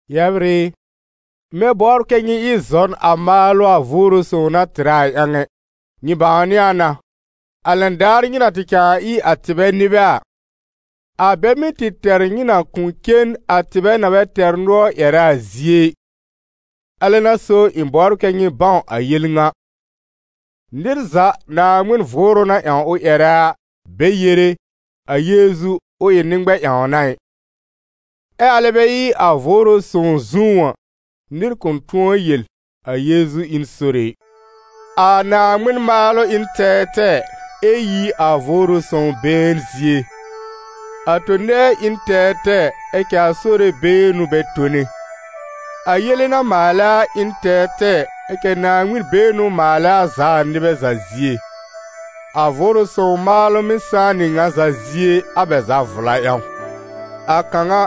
Yɛbr ɩ, ɩ̃ bɛ bɔbr kɛ́ nyɩ ɩ zɔn a maalʋ a Vʋʋrʋ Sõw na tɩrɛ a ƴãw ɛ. Nyɩ bãwnɩ a na, a lɛn daar nyɩ na tɩ cãa ɩ a tɩbɛ nɩbɛ a, a bɛ mɩ́ tɩ tɛr nyɩ na kʋ̃ cen a tɩbɛ na bɛ tɛr nʋɔr ƴɛrɛ a zie ɩ. Alɛ n'a so ɩ̃ bɔbr kɛ nyɩ bãw a yel ŋa: nɩr za Naaŋmɩn Vʋʋrʋ na ƴãw ʋ ƴɛrɛ a, be yere: «A Yeezu, ʋ ɩ nɩ-ŋmɛ-ƴãwna ɩ», ɛ alɛ bɛ ɩ a Vʋʋrʋ Sõw zũú a, nɩr kʋ̃ tʋ̃ɔ yel: «A Yeezu ɩ n Sore ɩ.» A Naaŋmɩn maalʋ ɩ n tɛɛtɛɛ, ɛ yi a Vʋʋrʋ Sõw been zie. A tõ-nɛɛ ɩ n tɛɛtɛɛ, ɛ cɛ a Sore been n'ʋ bɛ tone. A yele na maalɛ a ɩ n tɛɛtɛɛ, ɛ cɛ Naaŋmɩn-been n'ʋ maalɛ a za a nɩbɛ za zie. A Vʋʋrʋ Sõw maalʋ mɩ́ sãá nɩ ŋa za zie a bɛ za vla ƴãw. A kãw a,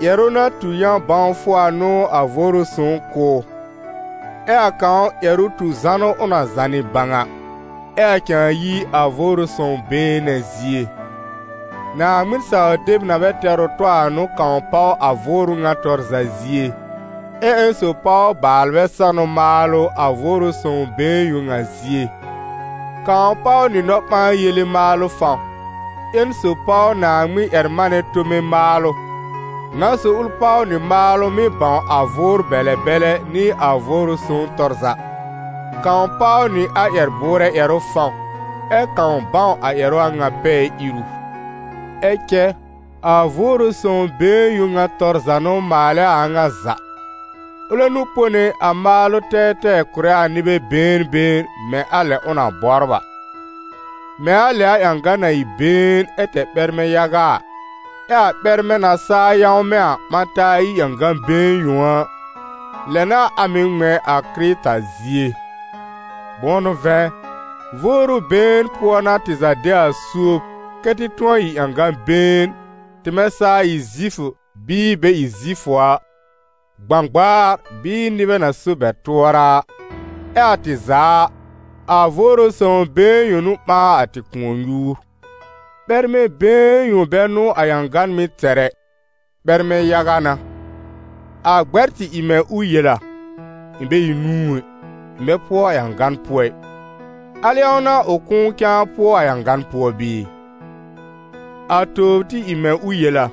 ƴɛrʋ na tu yã-bãwfʋ a n'ʋ a Vʋʋrʋ Sõw kʋ̀ ʋ, ɛ a kãw ƴɛrʋ tu zanʋ ʋ na zànɩ bãw a, ɛ a cãa yi a Vʋʋrʋ Sõw been nɛ zie. Naaŋmɩn-saw-deb na bɛ tɛr ʋ tɔ a n'ʋ kãw páw a Vʋʋrʋ ŋa tɔr za zie, ɛ ƴẽn sob páw baalbɛ sanʋ maalʋ a Vʋʋrʋ Sõw been yõ ŋa zie. Kãw páw nɩ nɔ-ɓãa-yele maalʋ fãw, ƴẽn sob páw Naaŋmɩn-ƴɛr-manɛ tome maalʋ, ŋa sob ʋl páw nɩ maalʋ mɩ́ bãw a vʋʋr-bɛlɛ-bɛlɛ nɩ a Vʋʋrʋ Sõw tɔr za; kãw páw nɩ a ƴɛr-bʋʋrɛ ƴɛrʋ fãw, ɛ kãw bãw a ƴɛrʋ a ŋa pɛɛ iru. Ɛ cɛ a Vʋʋrʋ Sõw been yõ ŋa tɔr za n'ʋ maalɛ a a ŋa za. Ʋlɛ n'ʋ pone a maalʋ tɛɛtɛɛ kʋ̀rɛ a nɩbɛ been been, mɛ̃ a lɛ ʋ na bɔbr a. Mɛ̃ a lɛ a ƴãgan na ɩ been ɛ tɛr ɓɛrmɛ yaga a, ɛ a ɓɛrmɛ na saa yãwmɛ̃ a, ɓã taa ɩ ƴãgan been yõ a, lɛ n'a a mɩ̀ ŋmɛ̃ a Kɩrɩta zie. Bʋ̃ʋ n'ʋ vɛ̃, Vʋʋrʋ been pʋɔ n'a tɩ za de a suob kɛ́ tɩ tʋ̃ɔ ɩ ƴãgan been, tɩmɛ saa ɩ Zifʋ bɩɩ bɛ ɩ a Zifʋ a, gbãgbaar bɩɩ nɩbɛ na so bɛ tʋɔra a, ɛ a tɩ za a, a Vʋʋrʋ Sõw been yõ n'ʋ ɓãa a tɩ kʋ̃ɔ-nyuur. Ɓɛrmɛ been yõ bɛ n'ʋ a ƴãgan mɩ́ tɛr ɛ, ɓɛrmɛ yaga n'a. A gbɛ́r tɩ ɩ mɛ̃ ʋ yel a: «Ɩ̃ bɛ ɩ nũu ɛ, ɩ̃ bɛ pʋɔ a ƴãgan pʋɔ ɩ», al ƴãw n'a ʋ kʋ̃ʋ cãa pʋɔ a ƴãgan pʋɔ bɩɩ? A tobr tɩ ɩ mɛ̃ ʋ yel a: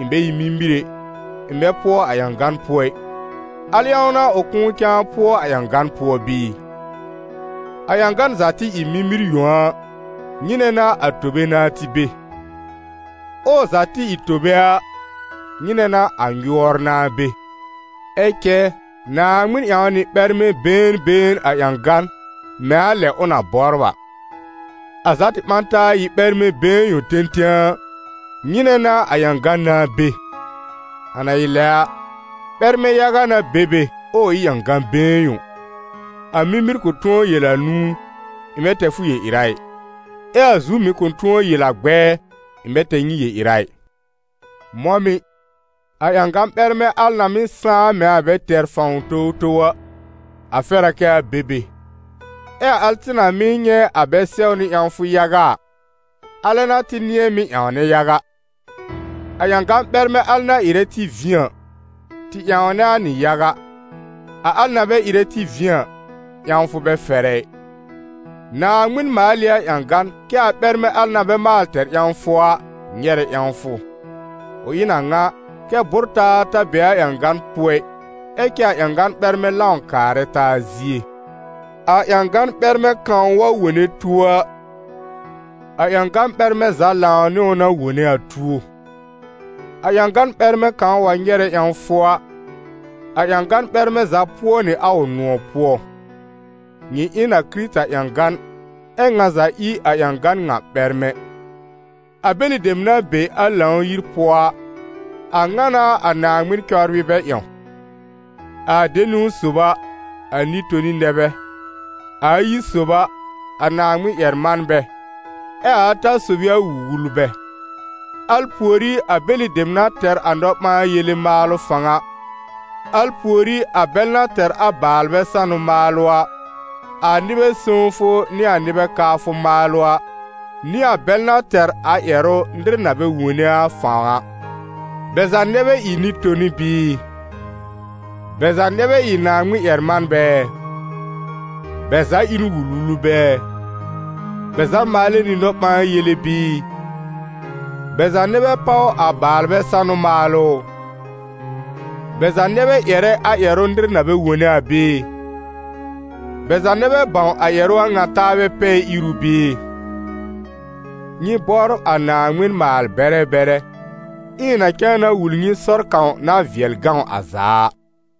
«Ɩ̃ bɛ ɩ mimir ɛ, ɩ̃ bɛ pʋɔ a ƴãgan pʋɔ ɩ», al ƴãw n'a ʋ kʋ̃ʋ cãa pʋɔ a ƴãgan pʋɔ bɩɩ? A ƴãgan za tɩ ɩ mimir yõ a, nyɩnɛ n'a a tobe nãá tɩ be? Ɛ ʋ za tɩ ɩ tobe a, nyɩnɛ n'a a nyʋɔr nãá be? Ɛ cɛ Naaŋmɩn ƴãw nɩ ɓɛrmɛ been been a ƴãgan mɛ̃ a lɛ ʋ na bɔbr a. A za tɩ ɓã taa ɩ ɓɛrmɛ been yõ tẽtẽ a, nyɩnɛ n'a a ƴãgan nãá be? A na ɩ lɛ a, ɓɛrmɛ yaga n'a be be, ɛ ʋ ɩ ƴãgan been yõ. A mimir kʋ̃ tʋ̃ɔ yel a nũu: «Ɩ̃ bɛ tɛr fʋ yel-ɩra ɩ», ɛ a zu mɩ̀ kʋ̃ tʋ̃ɔ yel a gbɛɛ: «Ɩ̃ bɛ tɛr nyɩ yel-ɩra ɩ.» Mɔ̃ mɩ̀, a ƴãgan ɓɛrmɛ al na mɩ́ sãá mɛ̃ a bɛ tɛr fãw towtow a, a fɛr a kɛ a be be; ɛ a al tɩ na mɩ́ nyɛ̃ a bɛ sɛwnɩ ƴãwfʋ yaga a, alɛ n'a tɩ nɩ̃ɛ mɩ́ ƴãwnɛ yaga; a ƴãgan ɓɛrmɛ al na ɩrɛ tɩ vĩ a, tɩ ƴãwnɛ a nɩ yaga, a al na bɛ ɩrɛ tɩ vĩ a, ƴãwfʋ bɛ fɛrɛ ɩ. Naaŋmɩn maal ɩ a ƴãgan, kɛ́ a ɓɛrmɛ al na bɛ maal tɛr ƴãwfʋ a, nyɛrɛ ƴãwfʋ. Ʋ ɩ n a ŋa, kɛ́ bʋ́r-taa ta be a ƴãgan pʋɔ ɩ, ɛ cɛ a ƴãgan ɓɛrmɛ lãw kaarɛ taa zie. A ƴãgan ɓɛrmɛ kãw wa wone tuo a, a ƴãgan ɓɛrmɛ za lãw nɩ ʋ na wone a tuo; a ƴãgan ɓɛrmɛ kãw wa nyɛrɛ ƴãwfʋ a, a ƴãgan ɓɛrmɛ za pʋɔ nɩ a ʋ nʋ̃ɔ̀ pʋɔ. Nyɩ ɩ n a Kɩrɩta ƴãgan, ɛ́ ŋa za ɩ a ƴãgan ŋa ɓɛrmɛ. A bɛlɩ dem na be a Lãw-yir pʋɔ a, a ŋa n'a a Naaŋmɩn cɔbrɩ bɛ ƴãw: a de niwn sob a, a nɩ-toni nɛ bɛ, a ayi sob a, a Naaŋmɩn-ƴɛr-manbɛ, ɛ a ata sob ɩ a wul-wulbɛ; al pùorí a bɛlɩ dem na tɛr a nɔ-ɓãa-yele maalʋ fãw a, al pùorí a bɛl na tɛr a baalbɛ sanʋ maalʋ a, a nɩbɛ sõwfʋ nɩ a nɩbɛ kaafʋ maalʋ a, nɩ a bɛl na tɛr a ƴɛrʋ nɩr na bɛ wone a fãw a. Bɛ za nɛ bɛ ɩ nɩ-toni bɩɩ? Bɛ za nɛ bɛ ɩ Naaŋmɩn-ƴɛr-manbɛ ɛ? Bɛ za ɩ n wul-wulbɛ ɛ? Bɛ za maalɛ nɩ nɔ-ɓãa-yele bɩɩ? Bɛ za nɛ bɛ páw a baalbɛ sanʋ maalʋ ʋ? Bɛ za nɛ bɛ ƴɛrɛ a ƴɛrʋ nɩr na bɛ wone a bɩɩ? Bɛ za nɛ bɛ bãw a ƴɛrʋ a ŋa taabɛ pɛɛ-iru bɩɩ? Nyɩ bɔbr a Naaŋmɩn maal-bɛrɛ bɛrɛ. Ɩ̃ɩ na cãa na wul nyɩ sɔr kãw na vɩɛl gãw a za a.